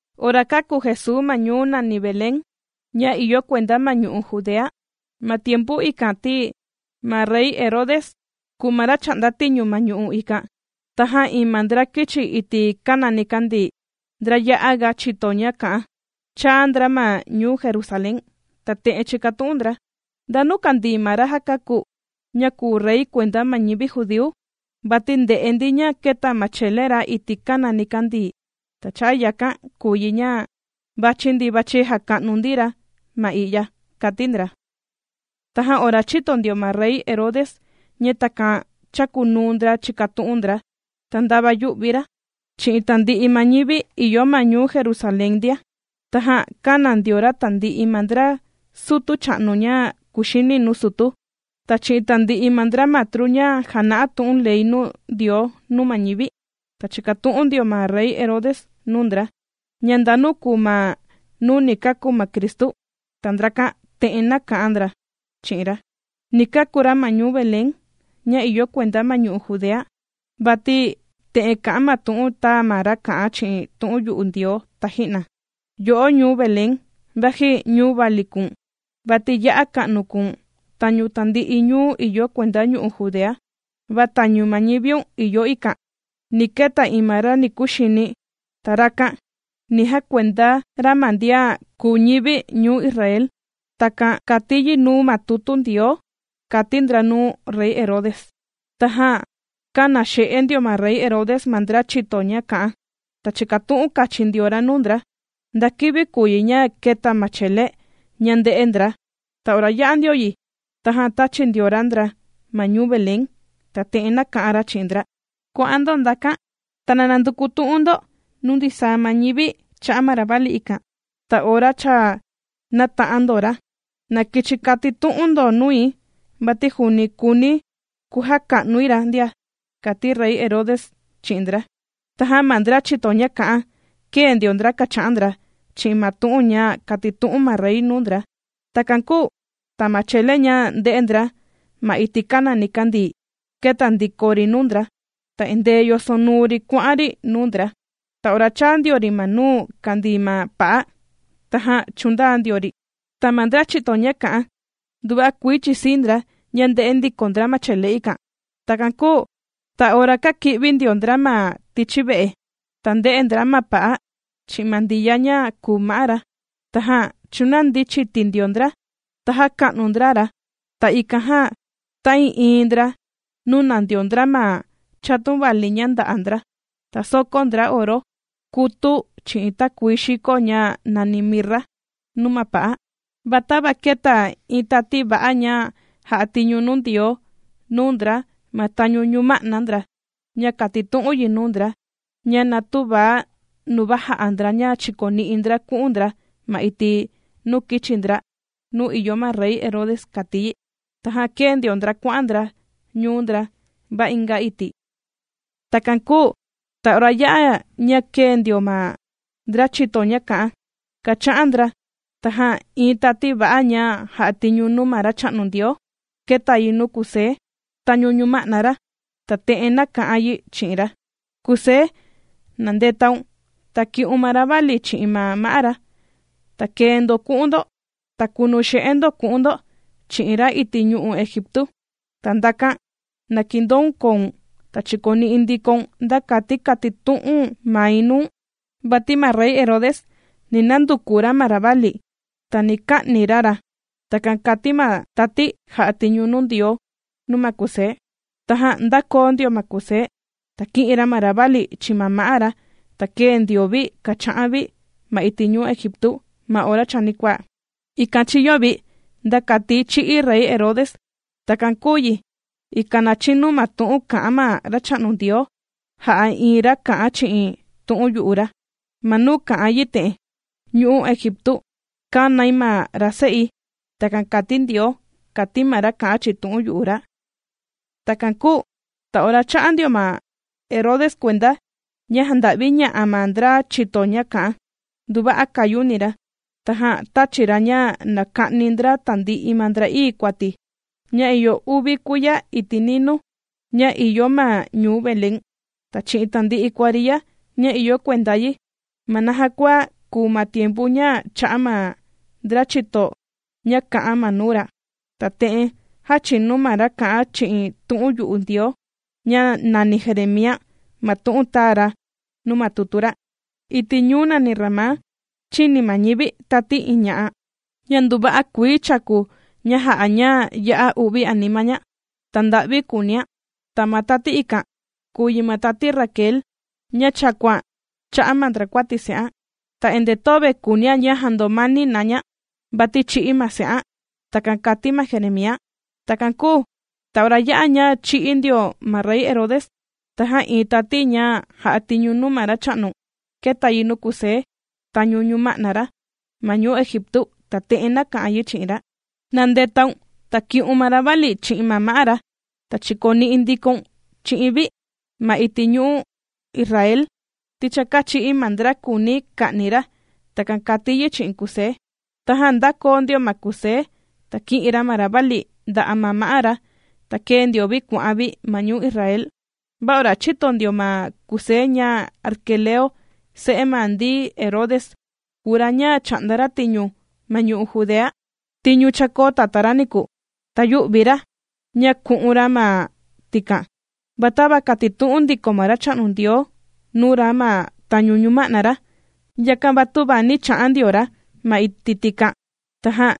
Ora kāku Jesuu ma ñuu nàni Belén, ña ìyo kuenda ma ñu'u' Judea, ma tiempu ikan ti, ma rey Herode kùu ma ra chā'nda tiñu ma ñu'u' ikan. Tajan iin ma ndra kīchi iti' kàna nikandii, ndra ya'a ga chìto ña kā'an, chāa ndra ma ñuu Jerusalén, ta te'en chīkatu'un ndra: ―¿Ndanu kàndii ma ra já kāku, ña kùu rey kuenda ma ñivi judíu? Vati ndē'e ndi ña kēta ma chele ra iti' kàna nikandii, ta cha'a' yakan kùu yi, ña vàchi ndi vàchi jàka'nu ndi ra ma i'ya ―kàti ndra. Tajan ora chīto ndio ma rey Herode ña takan chàkunuu ndra chìkatu'un ndra, ta ndava yū'vi ra, chi'in tandi'i ma ñivi ìyo ma ñuu Jerusalén ndia. Tajan kāna ndio ra tandi'i ma ndra sutu cha'nu ña kuxini nuu sutu, ta chi'in tandi'i ma ndra matru ña jàna'a tu'un ley Ndioo nuu ma ñivi, ta chīkatu'un ndio ma rey Herode nuu ndra, ña ndanu kùu ma nuu ni kàku ma Cristu. Ta ndrakan te'en nāka'an ndra chi'in ra: ―Ni kàku ra ma ñuu Belén ña ìyo kuenda ma ñu'u' Judea, vati te'en kà'an ma tu'un tāa ma ra kā'an chi'in tu'un yu'u Ndioo taji'na: Yo'o ñuu Belén, vaji ñuu vali kùu̱n, vati ya'a ka'nu kùu̱n tañu tandi'i ñuu ìyo kuenda ñu'u' Judea, va tañu ma ñiviun ìyo ikan, ni keta iin ma ra ni kuxini, ta rakan ni jakuenda ra ma ndian kùu ñivi̱ ñuu Israel. Takan kàti yi nuu ma tutu Ndioo ―kàti ndra nuu rey Herode. Tajan kāna xe'e ndio ma rey Herode ma ndra chìto ña kā'an, ta chīkatu'un kachin ndio ra nuu ndra, nda kivi kùu yi ña kēta ma chele ña ndē'e ndra. Ta ora yā'a ndio yi, tajan tāchi ndio ra ndra ma ñuu Belén, ta te'en nāka'an ra chi'in ndra: ―Kuà'an ndo ndakan, ta na nanduku tu'un ndo nuu ndisaa ma ñivi cha'a' ma ravali ikan. Ta ora cha nāta'an ndo ra, na kichi katitu'un ndo nui, vati juuni kùuni̱ kujaka'nui ra ndia ―kàti rey Herode chi'in ndra. Tajan ma ndra chìto ña kā'an, kēe ndio ndra kàcha'an ndra chi'in ma tu'un ña kātitu'un ma rey nuu ndra. Takan kūu ta ma chele ña ndē'e ndra ma iti' kàna nikandii, kēta ndiko ri nuu ndra, ta endee yosonuu ri kuà'an ri nuu ndra. Ta ora chāa ndio ri ma nuu kàndii ma pa'a, tajan chūndaa ndio ri. Ta ma ndra chìto ña kā'an, nduva'a kuii chīsii ndra ña ndē'e ndiko ndra ma chele ikan. Takan kūu ta ora kāki'vi ndio ndra ma tichi ve'e, ta ndē'e ndra ma pa'a chi'in ma Ndiya ña kùu ma'á ra. Tajan chūnandi chiti ndio ndra, ta jāka'nu ndra ra. Ta ikan jan, ta'ii'iin ndra nūna ndio ndra ma chatun vali ña nda'a ndra, ta sōkó ndra oro, kutu, chi'in takuii xiko ña nàni mirra nuu ma pa'a. Va tava kēta iin tati va'a ña jà'a tiñu nuu Ndioo nuu ndra ma tañu ñuma'na ndra, ña kātitu'un yi nuu ndra, ña na tüva nuva jà'a ndra ña chìkoni'i ndra ku'un ndra ma iti' nuu kīchi ndra nuu ìyo ma rey Herode kàti yi. Tajan kēe ndio ndra kuà'an ndra ñuu ndra, va inga iti'. Takan kūu ta ora yā'a ña kēe ndio ma ndra chìto ña kā'an kàcha'an ndra, tajan iin tati va'a ña jà'a tiñu nuu ma Racha'nu Ndioo, kēta yi nuu Kusé tañu ñuma'na ra, ta te'en nāka'an yi chi'in ra: ―Kusé, na ndetaun, ta ki'un ma ravali chi'in ma ma'á ra, ta kee ndo ku'un ndo ta kunu xe'e ndo ku'un ndo chi'in ra iti' ñu'u' Egiptu. Ta ndakan na kindoun koun, ta chikoni'i ndikoun nda kati katitu'un mai nuu̱n. Vati ma rey Herode, ni nanduku ra ma ravali, ta ni ka'ni ra ra. ―Takan kàti ma tati jà'a tiñu nuu Ndioo nuu ma Kusé. Tajan ndākoo ndio ma Kusé, ta kī'in ra ma ravali chi'in ma ma'á ra, ta kēe ndio vi kàcha'an vi ma iti' ñu'u' Egiptu ma ora chanikuaa. Ikan chīyo vi, nda kati chī'í rey Herode. Takan kūu yi, ikan na chinu ma tu'un kā'an ma Racha'nu Ndioo, jà'a iin ra kā'an chi'in tu'un yu'u ra, ma nuu kà'an yi te'en: “Ñu'u' Egiptu kānai ma ra se'i.” Takan kàti Ndioo, kàti ma ra kà'an chi'in tu'un yu'u ra. Takan kūu ta ora chā'a ndio ma Herode kuenda, ña jānda'viña'a ma ndra chìto ña kā'an ra, nduva'a kāyuni ra. Tajan tāchi ra ña na ka'ni ndra tandi'i ma ndra'ii kuati, ña ìyo uvi kuiya iti' ninuu, ña ìyo ma ñuu Belén, ta chi'in tandi'i kuariya ña ìyo kuenda yi, ma naja kua kùu ma tiempu ña chā'a ma ndra chìto ña kā'an ma nuu ra. Ta te'en jāchinu ma ra kā'an chi'in tu'un yu'u Ndioo, ña nàni Jeremía ma tu'un tāa ra nuu ma tutu ra: Iti' ñuu nàni Ramá chīni ma ñivi tati iin ña'a, ña nduva'a kuii chàku ña jà'a ña ya'a u'vi anima ña, ta nda'vi kùunian. Ta ma tati ikan kùu yi ma tati Raquel, ña chàkuan cha'a' ma ndrakuati se'an. Ta endee töve kuunian ña jàndomani na ña, vati chī'í ma se'an. Takan kàti ma Jeremía. Takan kūu ta ora yā'a ña chī'í ndio ma rey Herode, tajan iin tati ña jà'a tiñu nuu ma Racha'nu, kēta yi nuu Kusé tañu ñuma'na ra ma ñuu Egiptu, ta te'en nāka'an yi chi'in ra: ―Na ndetaun, ta ki'un ma ravali chi'in ma ma'á ra, ta chìkoni'i ndikoun chi'in vi ma iti' ñu'u' Israel, ti cha kāchi'í ma ndra kùuni ka'ni ra. ―Takan kàti yi chi'in Kusé. Tajan ndākoo ndio ma Kusé, ta kī'in ra ma ravali nda'a' ma ma'á ra, ta kēe ndio vi kuà'an vi ma ñuu Israel. Va ora chīto ndio ma Kusé ña Arquelao se'e ma ndi Herode, kùu ra ña chà'nda ra tiñu, ma ñu'u' Judea, tiñu chākoo tatá ra niku, ta yū'vi ra ña ku'un ra ma tikan, va tava kātitu'un ndiko ma Racha'nu Ndioo nuu ra ma tañu ñuma'na ra, yakan va tüva nī cha'an ndio ra ma iti' tikan, tajan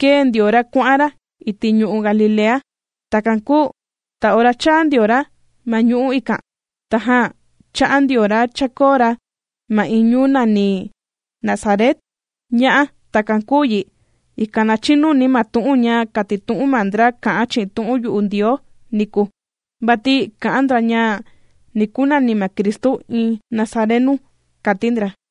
kēe ndio ra kuà'an ra iti' ñu'u' Galilea. Takan kūu ta ora chāa ndio ra ma ñu'u' ikan, tajan chā'an ndio ra chākoo ra ma iin ñuu nàni Nazaret. Ña'á takan kūu yi, ikan na chinu ma tu'un ña kātitu'un ma ndra kā'an chi'in tu'un yu'u Ndioo niku, vati kà'an ndra ña ni kunani ma Cristu, iin Nazarenu, kāti ndra.